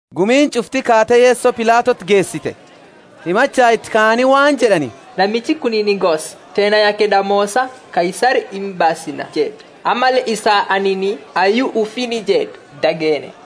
Gumiini ch'ufti kaate Yeso Pilatoti geesite. Himacha iti kaani waan jed'ani, Namichi kunini gosa teenna yake damoosa Kaisari imbaasina jed'e, Ammalle isaa, anini, hayyu ufiini jed'u d'ageenne.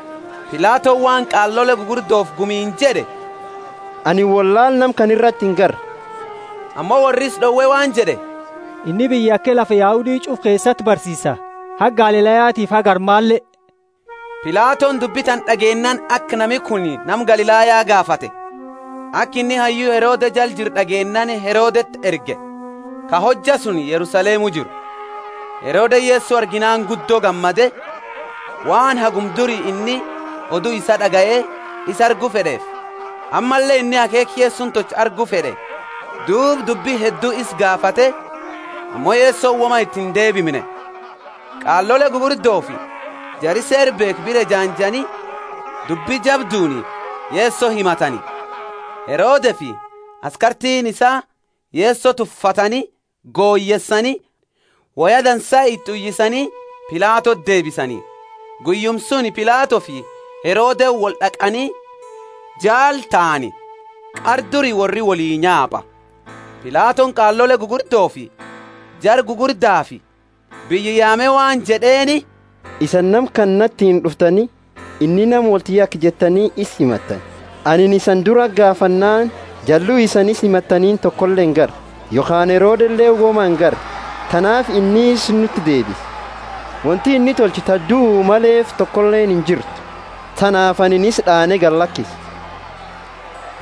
Pilatoni waan qaalole gugurdofi gumiini jed'e, Anini wollaala nama kana irati ingarre. Ammo worri isa d'owe waan jed'e, Inni biyya yake lafa Yahudi ch'ufa keesati barsiisa, haga Galilayatiifi haga armale. Pilatoni dubbi tana d'ageennaani aka nami kuni nama Galilaya gaafate. Aka inni hayyu Herode jala jiru d'ageennaani Herodeti erge, ka hojja suni Yerusalemu jiru. Herodeni Yeso arginaani guddo gammade, waan haguma duri inni odu isaa d'agaye isa argu fed'eefi; ammalle inni akheekha Yesoni tolchu argu fed'e. Duuba dubbi heddu isa gaafate, ammo Yesoni woma iti indeebimne. Qaalole gugurdofi jari Seera beekhu bira ejaanjani, dubbi jabduuni Yeso himatani. Herodefi askartiini isaa Yeso tuffatani goyeesani, woya dansa iti uyisani Pilatoti deebisani. Guyyuma suni Pilatofi Herodeni wold'aqani jaala tahani; qara duri worri wolii nyaapa. Pilatoni qaalole gugurdofi jara gugurdafi biyya yaame waan jed'eeni, isani nama kana natiini d'uftani, inni nama wolti yake jettani isa himattani. Anini isani durati gaafannaani jallu isani isa himattanini tokole ingarre. Yokhaani Herodeleeni woma ingarre, tanaafi inni isa nuti deebise. Wonti inni tolche ta duu maleefi tokoleeni injirtu. Tanaafi anini isa d'aane galakisa. [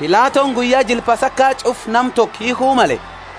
Pilatoni guyya jila Pasaka ch'ufa nama toko hiikhu male.]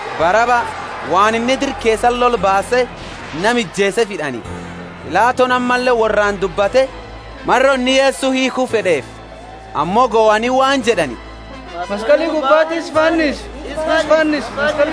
Baraba, waan inni dira keesa lola baase nama ijeeseefi hid'ani. Pilatoni ammalle worraani dubbate, maro inni Yeso hiikhu fed'eefi. Ammo gohani waan jed'ani, Maskali gubbati isa fannisi, isa fannisi.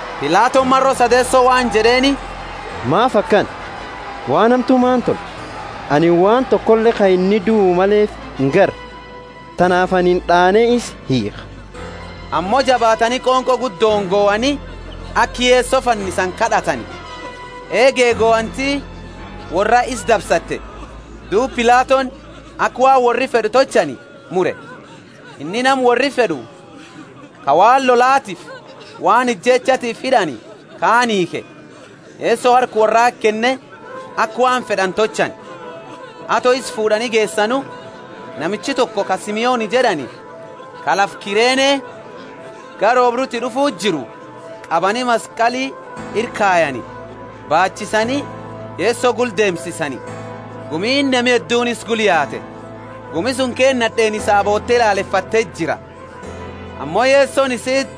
Pilatoni maro sadeeso waan jed'eeni, Maafi akana? Waan hamtu maani tolche? Anini waan tokole ka inni duu maleefi ingarre. Tanaafi anini d'aane isa hiikha. Ammo jabaatani qonqo guddooni gohani, aka Yeso fannisani kad'atani. Eege gohanti worraa isa dabsate. Duuba Pilatoni aka waan worri fed'u tolchani mure. Inni nama worri fed'u, ka waan lolatiifi waan ijeechatifi hid'ani kaani hiikhe, Yeso harka worrati kenne aka waan fed'ani tolchani. Ato isa fuud'ani geesanu, namicha toko ka Simoni jed'ani ka lafa Kirene gara oobruti d'ufuu jiru, qabani maskali ira kayani, baachisani Yeso gula deemsisani. Gumiini nami hedduuni isa gula yaate. Gumi suni keesa nad'eeni isaa boote lalefate jira. Ammo Yesoni isiiti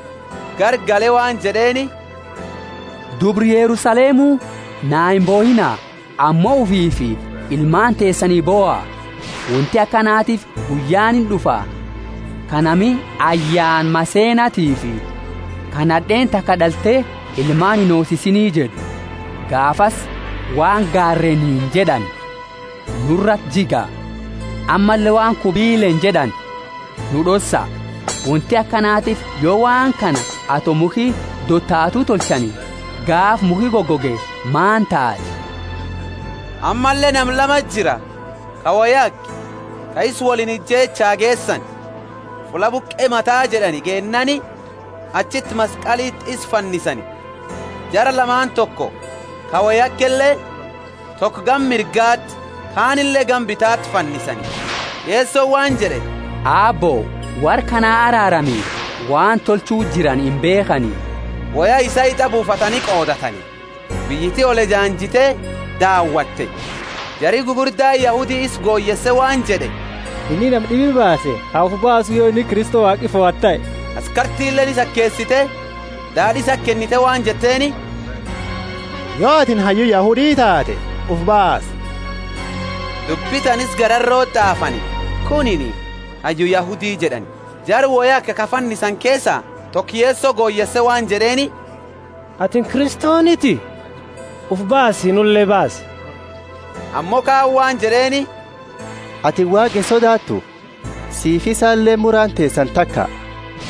garagale waan jed'eeni, Dubra Yerusalemu, naa imbohiina, ammo ufiifi ilmaani teesani boha. Wonti akanatiifi guyyaani ind'ufa, ka nami ayyaana maseenatifi ka nad'eeni taka d'alte ilmaani inhoosisini jed'u. Gaafasi waan gaareeniini jed'ani. Nurati jiga, ammalle waan kubileeni jed'ani, Nu d'ossa. Wonti akanatiifi yo waan kana ato mukhi dotaatu tolchani, gaafa mukhi goge maani taati? Ammalle nama lamati jira, ka wo yake, ka isa woliini ijeechaa geesani. Fulla Buqe mata jed'ani geennaani, achiti maskaliti isa fannisani. Jara lamaani toko ka wo yakele, toko gama mirgati kanile gama bitati fannisani. Yesoni waan jed'e, Aabbo, worra kana araarami, waan tolchu jirani imbeekhani. Woya isaa hit'a buufatani qoodatani. Biyyiti oliejanjite daawatte; jari gugurdaani Yahudi isa goyeese waan jed'e, inni nama d'ibi baase ha ufi baasu yo inni Kristo Waaqi fohate tahe. Askartileeni isa akeesite daad'i isati kennite, waan jetteeni, yo atini hayyu Yahudi taate ufi baasi. Dubbi tana isa gararoti t'aafani, Kunini hayyu Yahudi jed'ani. Jara wo yake ka fannisani keesa toko Yeso goyeese waan jed'eeni, Atini Kristoniti? Ufi baasi, nule bassi. Ammo kaani waan jed'eeni, Atini Waaqa insodaatu? Sifi isale muraani teesani taka.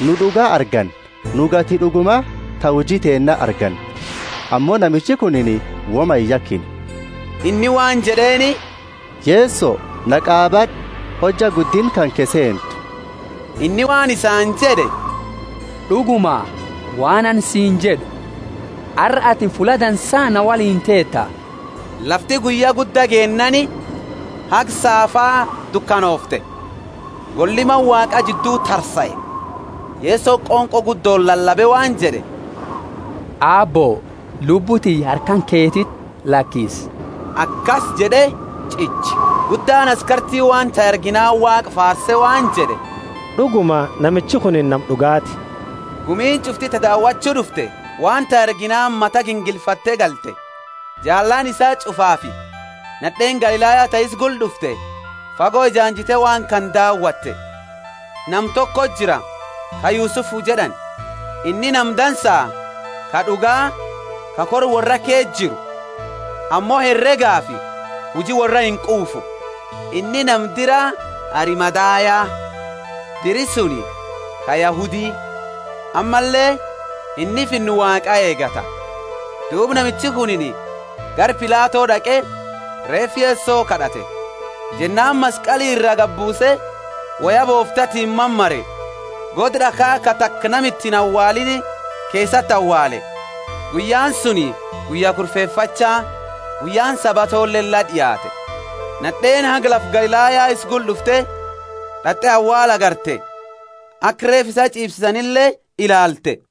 Nu d'uga arganna, nu gati d'uguma ta huji teenna arganna; ammo namichi kunini woma iyakine. Inni waan jed'eeni, Yeso, na qaabad'u, hojja guddinna kanke seentu. Inni waan isaani jed'e, D'uguma, waan anini siini jed'u, Arra atini fulla dansa na woliini teeta. Lafti guyya gudda geennaani haga saafa dukanoofte. Golli Mana Waaqa jiddu tarsae. Yesoni qonqo guddooni lalabe waan jed'e, Aabbo, lubbu tiyya harka kanketi lakisa! Akasi jed'e ch'iche. Guddaani askarti waan tahe arginaani Waaqa faarse waan jed'e, D'uguma namichi kunini nama d'ugaati! Gumiini ch'ufti ta daawachu d'ufte waan tahe arginaani mata gingilfatte galte. Jaalaani isaa ch'ufaafi nad'eeni Galilaya ta isa gula d'ufte fago ejaanjatte waan kana daawate. Nama toko jira ka Yusufu jed'ani. Inni nama dansa, ka d'uga, ka kora worra ke jiru, ammo heregafi huji worra inquufu. Inni nama dira Arimathaya, diri suni, ka Yahudi; ammalle inni Finna Waaqa eegata. Duuba namichi kunini gara Pilato d'aqe, reefa Yeso kad'ate. Jennaani maskali ira gabuuse, woya booftatiini mamare, goda d'akha ka taka nama iti inawaaliini keesati awaale. Guyyaani suni guyya Kurfefacha, guyyaani Sabatoleeni la d'iaate. Nad'eeni haga lafa Galilaya isa gula d'ufte d'at'e awaala agarte, aka reefa ch'iifsisanile ilaalte.